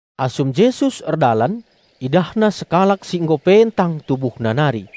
Asum Jesus erdalan, IdahNa sekalak si nggo pentang tubuhna nari.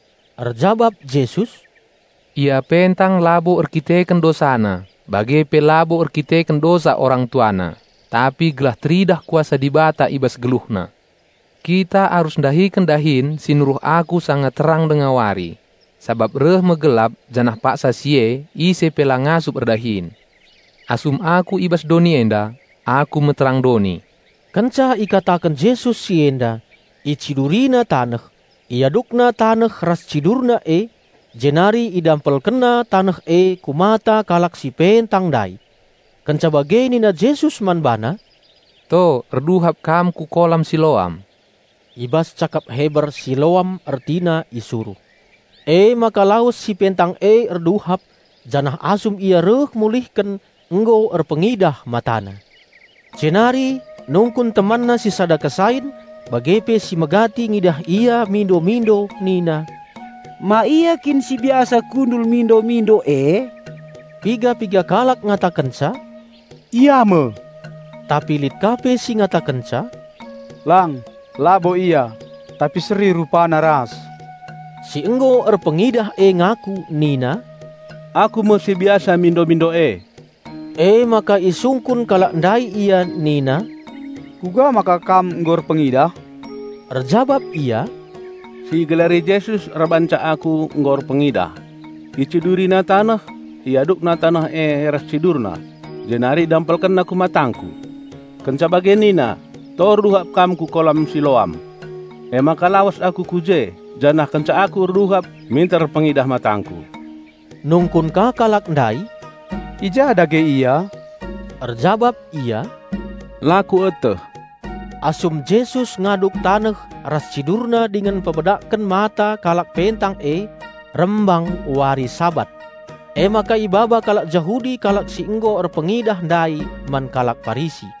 Erjabap Jesus, "Ia pentang labo erkiteken dosana bage pe labo erkiteken dosa orang tuana, tapi gelah teridah kuasa Dibata i bas geluhna. Kita arus ndahiken dahin si nuruh Aku sanga terang denga wari; sabap reh me gelap janah paksa si e ise pe la ngasup erdahin. Asum Aku i bas doni enda, Aku me terang doni." Kenca ikataken Jesus si enda, IciduriNa taneh, IadukNa taneh ras CidurNa e, jenari IdampelkenNa taneh e ku mata kalak si pentang ndai. Kenca bage nina Jesus man bana, "To erduhap kam ku kolam Siloam." (I bas cakap Heber Siloam ertina "Isuruh".) Emaka lawes si pentang e erduhap; janah asum ia reh mulihken nggo erpengidah matana. Jenari nungkun temanna si sada kesain bage pe si megati ngidah ia mindo-mindo nina, "Ma ia kin si biasa kundul mindo-mindo e?" Piga-piga kalak ngatakenca, "Ia me," tapi lit ka pe si ngatakenca, "Lang, labo ia. Tapi seri rupana ras." Si nggo erpengidah e ngaku nina, "Aku me si biasa mindo-mindo e." Emaka isungkun kalak ndai ia nina, "Kuga maka kam nggo erpengidah?" Erjabap ia, "Si igelari Jesus erbahanca aku nggo erpengidah. IciduriNa taneh, IadukNa taneh e ras CidurNa jenari IdampelkenNa ku matangku. Kenca bage nina, 'To erduhap kam ku kolam Siloam.' Emaka lawes aku ku je, janah kenca aku erduhap minter erpengidah matangku." Nungkun ka kalak ndai, "I ja dage Ia?" Erjabap ia, "La kueteh." Asum Jesus ngaduk taneh ras CidurNa dingen mpemedakken mata kalak pentang e, rembang wari Sabat. Emaka ibaba kalak Jahudi kalak si nggo erpengidah ndai man kalak Parisi.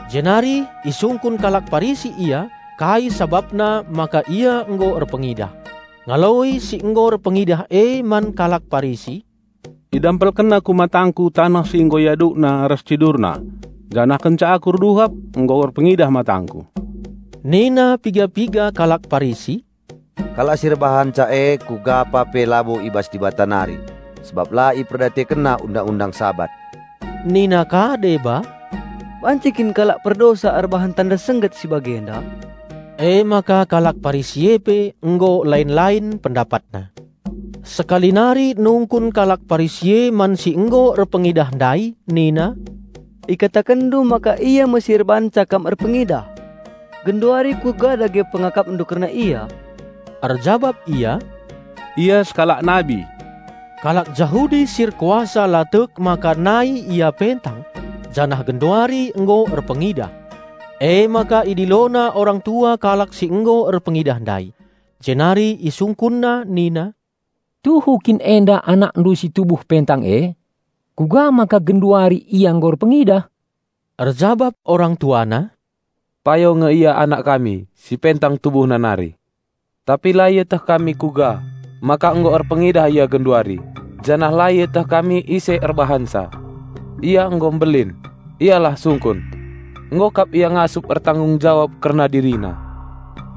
Jenari isungkun kalak Parisi ia kai sabapna maka ia nggo erpengidah. Ngaloi si nggo erpengidah e man kalak Parisi, "IdampelkenNa ku matangku taneh si nggo IadukNa ras CidurNa. Janah kenca aku erduhap, nggo erpengidah matangku." Nina piga-piga kalak Parisi, "Kalak si erbahanca e kugapa pe labo i bas Dibata nari, sabap la IperdiatekenNa Undang-undang Sabat." Nina ka deba, "Banci kin kalak perdosa erbahan tanda sengget si bagenda?" Emaka kalak Parisi e pe nggo lain-lain pendapatna. Sekali nari nungkun kalak Parisi e man si nggo erpengidah ndai nina, "Ikatakenndu maka Ia me si erbahanca kam erpengidah. Genduari kuga dage pengakapndu kerna Ia?" Erjabap ia, "Ia sekalak nabi." Kalak Jahudi si erkuasa la tek maka nai ia pentang, janah genduari nggo erpengidah. Emaka idilona orang tua kalak si nggo erpengidah ndai. Jenari isungkunna nina, "Tuhu kin enda anakndu si tubuh pentang e? Kuga maka genduari ia nggo erpengidah?" Erjabap orang tuana, "Payo nge ia anak kami si pentang tubuhna nari. Tapi la ieteh kami kuga maka nggo erpengidah ia genduari janah la ieteh kami ise erbahanca. Ia nggo mbelin, ialah sungkun! Nggo kap ia ngasup ertanggung jawab kerna dirina."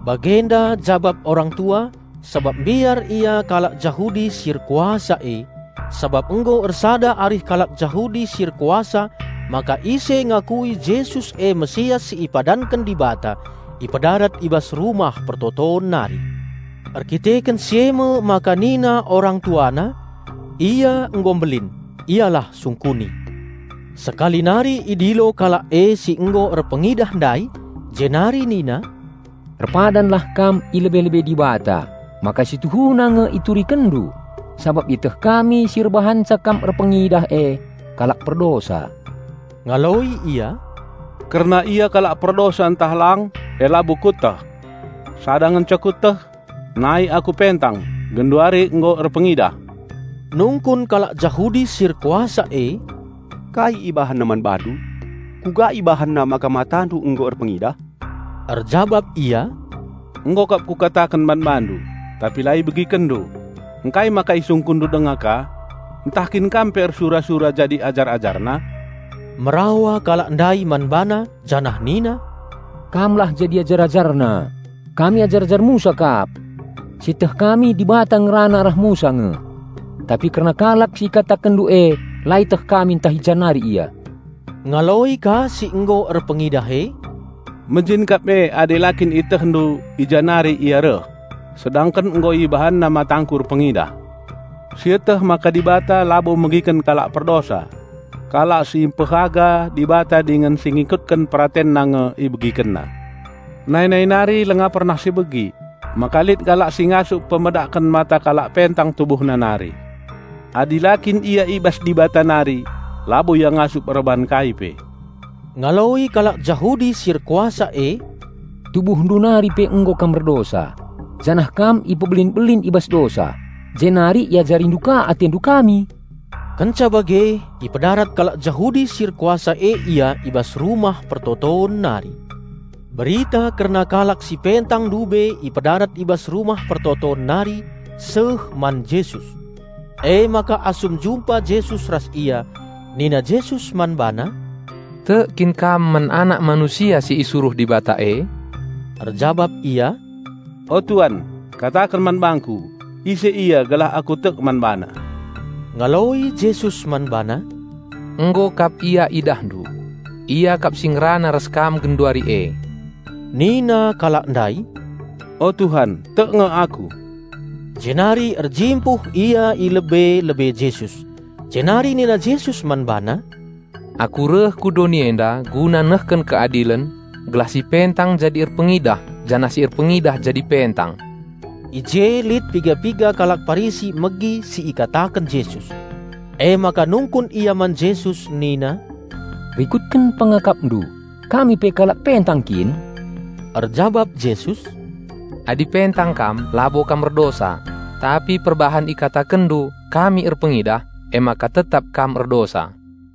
Bagenda jabap orang tua sabap mbiar ia kalak Jahudi si erkuasa e. Sabap nggo ersada arih kalak Jahudi si erkuasa maka ise ngakui Jesus e Raja Penampat si ipadanken Dibata, ipedarat i bas rumah persembahen nari. Erdandanken si e me maka nina orang tuana, "Ia nggo mbelin, ialah sungkuni." Sekali nari idilo kalak e si nggo erpengidah ndai, jenari nina, "Erpadanlah kam i lebe-lebe Dibata maka si tuhuna nge iturikenndu sabap ieteh kami si erbahanca kam erpengidah e kalak perdosa." Ngaloi ia, "Kerna Ia kalak perdosa ntah lang, e labo kueteh. Sada ngenca kueteh: Nai aku pentang, genduari nggo erpengidah." Nungkun kalak Jahudi si erkuasa e, "Kai IbahanNa man bandu? Kuga IbahanNa maka matandu nggo erpengidah?" Erjabap ia, "Nggo kap kukataken man bandu, tapi la ibegikenndu. Ngkai maka isungkunndu denga ka. Ntah kin kam pe ersura-sura jadi ajar-AjarNa?" Merawa kalak ndai man bana janah nina, "Kamlah jadi ajar-AjarNa; kami ajar-ajar Musa kap. Si ieteh kami Dibata ngerana arah Musa nge. Tapi kerna kalak si ikatakenndu e la ieteh kami ntah i ja nari Ia." Ngaloi ka si nggo erpengidah e, "Mejin kap e adi la kin ietehndu i ja nari Ia reh, sedangken nggo IbahanNa matangku erpengidah! Sieteh maka Dibata labo megiken kalak perdosa. Kalak si mpehaga Dibata dingen si ngikutken PeratenNa nge IbegikenNa. Nai-nai nari langa pernah si begi maka lit kalak si ngasup pemedakken mata kalak pentang tubuhna nari. Adi la kin ia i bas Dibata nari, labo ia ngasup erbahan kai pe." Ngaloi kalak Jahudi si erkuasa e, "Tubuhndu nari pe nggo kam erdosa, janah kam ipebelin-belin i bas dosa, jenari iajarindu ka atendu kami?" Kenca bage ipedarat kalak Jahudi si erkuasa e ia i bas rumah persembahen nari. Berita kerna kalak si pentang ndube ipedarat i bas rumah persembahen nari seh man Jesus. Emaka asum jumpa Jesus ras ia, nina Jesus man bana, "Tek kin kam man Anak Manusia si isuruh Dibata e?" Erjabap ia, "O Tuan, kataken man bangku ise Ia gelah aku tek man BaNa." Ngaloi Jesus man bana, "Nggo kap Ia idahndu. Ia kap si ngerana ras kam genduari e." Nina kalak ndai, "O Tuhan, tek nge aku!" Jenari erjimpuh ia i lebe-lebe Jesus. Jenari nina Jesus man bana, "Aku reh ku doni enda guna nehken keadilen, gelah si pentang jadi erpengidah janah si erpengidah jadi pentang." I je lit piga-piga kalak Parisi megi si ikataken Jesus. Emaka nungkun ia man Jesus nina, "Rikutken pengakapndu kami pe kalak pentang kin?" Erjabap Jesus, "Adi pentang kam labo kam erdosa; tapi perbahan ikatakenndu, 'Kami erpengidah,' emaka tetap kam erdosa."